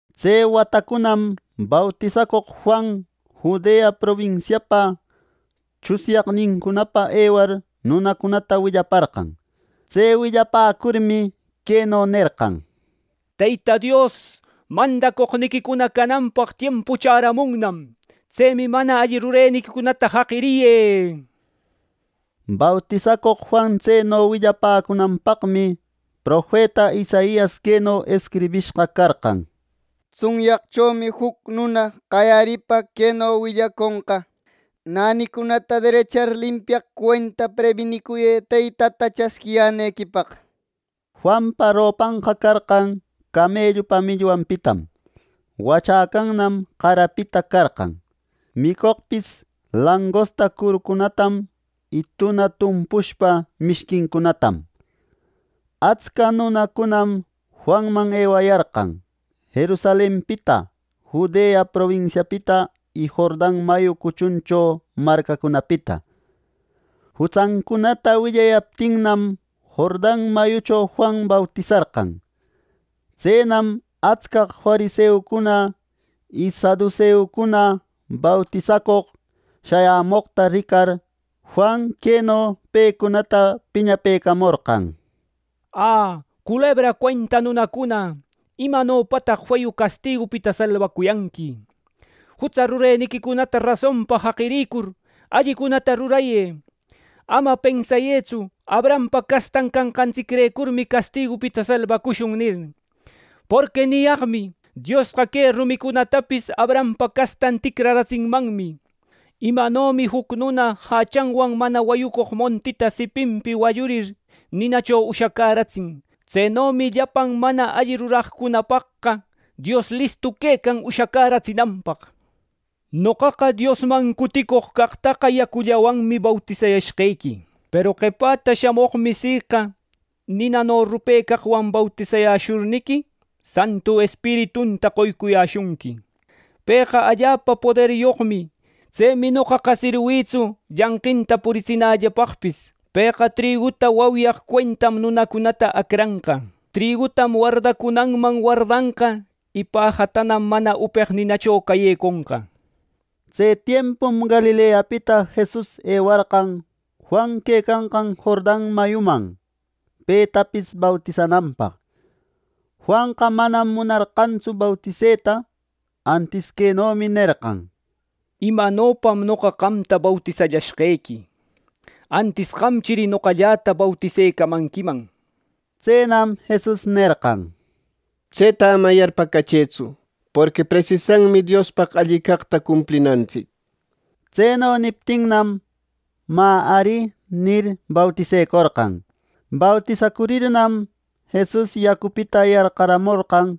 Tse watacunam bautisacoq Juan Judea probinsiapa tsunyaqnincunapa ewar nunacunata willaparqan. Tse willapäcurmi, queno nerqan: —Teyta Dios mandacoqniquicuna cananpaq tiempu chäramunnam. ¡Tsemi mana alli rureniquicunata jaqiriyë! —nir. Bautisacoq Juan tseno willapäcunanpaqmi profeta Isaias queno escribishqa carqan: “Tsunyaqchomi juc nuna qayaripa queno willaconqa: ‘Nänicunata derechar limpiaq cuenta prebinicuyë Teytata chasquinequipaq’” nir. Juanpa ropanqa carqan camellupa millwanpitam. Wachäcannam qarapita carqan. Micoqpis langosta curucunatam y tuna tumpushpa mishquincunatam. Atsca nunacunam Juanman ewayarqan: Jerusalenpita, Judea probinsiapita y Jordan mayu cuchuncho marcacunapita. Jutsancunata willayaptinnam Jordan mayucho Juan bautisarqan. Tseman atscaq fariseucuna y saduseucuna bautisacoq shayämoqta ricar, Juan queno pecunata piñapëcamorqan: —Ä, culebra cuenta nunacuna, ¿imanopataq allapa feyu castigupita salbacuyanqui! Jutsa rureniquicunata rasonpa jaqirïcur, allicunatana rurayë. Ama pensayëtsu: ‘Abrahampa castan canqantsicrecurmi castigupita salbacushun’ nir. Porqui niyaqmi: Diosqa que rumicunatapis Abrahampa castanqa ticraratsinmanmi. Imanomi juc nuna jachanwan mana wayücoq montinta siquipita wallurir, ninacho ushacäratsin, tsenomi llapan mana alli ruraqcunapaqqa Dios listu quecan ushacäratsinanpaq. Noqaqa Diosman cutiquicoq caqtaqa yacullawanmi bautisayashqequi. Peru qepäta shamoqmi siqa, ninano rupecaqwan bautisayäshurniqui, Santu Espiritunta qoyäshunqui. Pëqa allapa poderyoqmi. Tsemi noqaqa sirwïtsu llanqinta puritsinällapaqpis. Pëqa triguta wauyaq cuentam nunacunata acranqa. Trigutam wardacunanman wardanqa y pajatanam mana upeq ninacho cayeconqa. Tse tiempum Galileapita Jesus ewarqan Juan quecanqan Jordan mayuman, petapis bautisananpaq. Juanqa manam munarqantsu bautiseta. Antis quenomi nerqan: —¿Imanopam noqa qamta bautisallashqequi! ¡Antis qamchiri noqalläta bautisecamanquiman! —nir. Tsenam Jesus nerqan: —Tseta ama yarpäcachëtsu, porqui presisanmi Diospaq alli caqta cumplinantsic —nir. Tseno niptinnam, “Mä ari” nir, bautisecorqan. Bautisacurirnam, Jesus yacupita yarqaramorqan.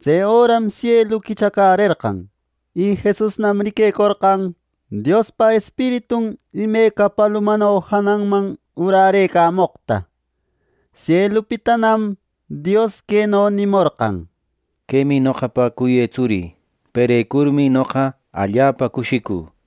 Tse öram sielu quichacärerqan, y Jesusnam riquecorqan Diospa Espiritun imeca palumano jananman urärëcamoqta. Sielupitanam Dios queno nimorqan: —Quemi noqapa cuyë Tsurï. ¡Perecurmi noqa allapa cushicü! —nir.